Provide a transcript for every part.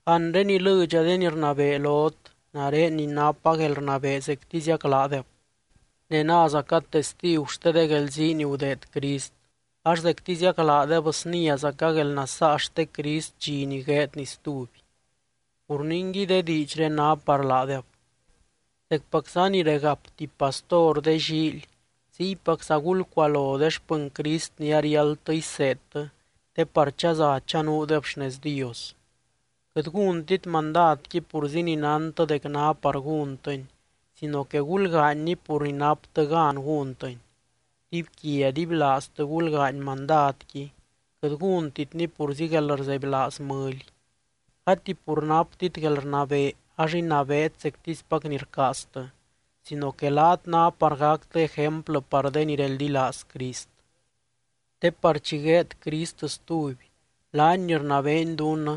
Anre ilɨdxa de ni rnabee lot, nare ni napa guelrnabee zectiziac laadeb. Ne názaca testigu xte de guelzii ni gudeed Crist, ax zectiziac laadeb sniázaca guelnasaa xte Crist dxi ni gueedny stuby. Pur ningui, de diidxré ná par laadeb: Zecpacza ni regap tuby pastor de llíily, ziypacza gulcualo de xpɨny Crist ni ariáldtɨ iseedtɨ te par chaza chanuudeb xnez Dios. Quɨt gúntit mandadqui purzi ni nántɨ dec ná par gúntɨni sino que gulgaanyni pur ni naptɨ gan gúntɨni. Dibyquia dibylaaztɨ gulgaany mandadqui, quɨt gúntitni purzi guelrzebylaaz mɨly. Gati pur naptit guelrnabee ax inabeet zectispac ni rcaaztɨ, sino que laat ná par gactɨ ejemplɨ par de ni reldilaaz Crist. Te par chi gueed Crist stuby, laany ni rnabeeny dunnɨ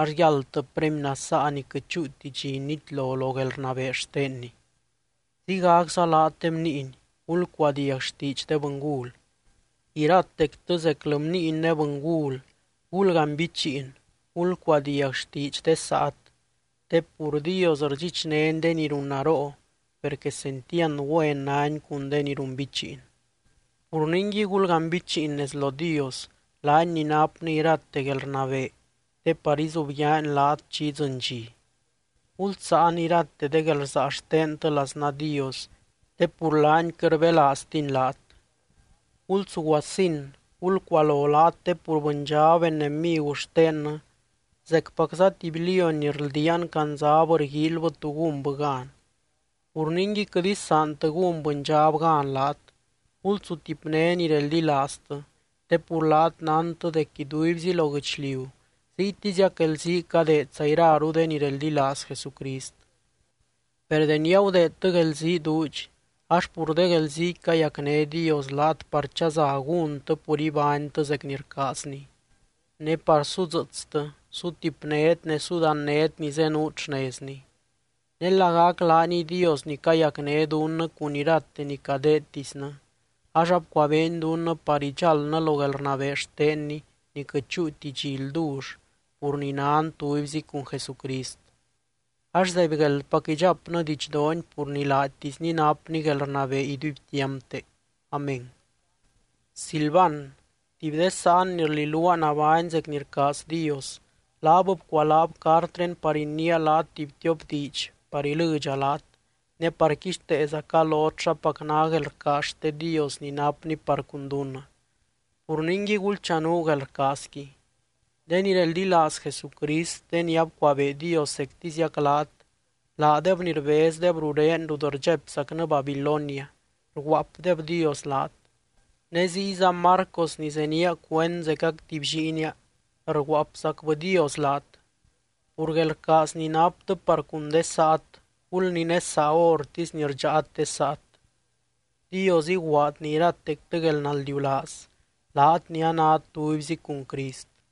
ax yáldtɨ premy nasaa ni quɨt chúuti dxi nitlo lo guelrnabee xtenny. Ziygacza laat de bniiny, gulcuadiag xtiidx de bɨngul. Iratectɨ zeclɨ bniiny ne bɨngul, gulganbichiin, gulcuadiag xtiidx de saat te pur: Dios rdxichnény de ni runnaroo, per quesentiand güen nány cun de ni runbichiin. Pur ningui, gulganbichiin nez lo Dios, laany ni napny irate guelrnabee te par izubyaany laat chi idzɨny dxi. Gulsáan irate de guelrsaa xtentɨ laznaa Dios, te pur laany quɨt rbelaaztiny laat. Gulsuguasin, gulcualo laat te pur bɨndxab enemigu xtennɨ, zecpacza tuby lióny ni rldiaan candzab rguíilybɨ tú gúnbɨ gan. Pur ningui, quɨt isaantɨ gún bɨndxab gan laat. Gulsutipné ni reldilaaztɨ, te pur laat nántɨ dec iduibzi lo guɨchliu ziytiziac guelzii cadeedza iraru de ni reldilaaz Jesucrist. Per deni agudeedtɨ guelzii duudx, ax pur de guelziiqui cayacné Dios laat par chaza gúntɨ pur ibánytɨ zec ni rcaazny, ne par sudzɨɨtstɨ, sutipnét ne sudannét ni zenuut xnezny. Ne lagac laaniy Dios ni cayacné dunnɨ cun irate ni cadeedtisnɨ, ax abcuabeeny dunnɨ par idxáldnɨ lo guelrnabee xtenny ni quɨt chúuti dxi ldull pur ni nan tubyzi cun Jesucrist. Ax zaibgueldpac idxapnɨ didxdoony pur ni laatisny napny guelrnabee iduibtiampte. Amén. Silvan, tuby de sáan ni rliluaa nabány zec ni rcaaz Dios, laab bcualaab cartré par iniia laat tuby tiop diidx par ilɨdxa laat, ne par quixteezaca lot xapac ná guelrcaaz xte Dios ni napny par cun dunnɨ. Pur ningui gulchanuu guelrcaazqui. De ni reldilaaz Jesucrist, de ni abcuabee Dios zectiziac laat, laadeb ni rbezdeb ruré rut rdxaipzacnɨ Babilonia, rguaapdebdios laat. Ne ziyza Marcos ni zenía cuend zecac tuby lliinia rguaapzacbɨdios laat. Pur guelrcaaz ni naptɨ par cun de saat, gulninésaa hórtisy ni rdxáat de saat. Dios iguaadny iratectɨ guelnaldiulaaz, laat ni anát tubyzi cun Crist.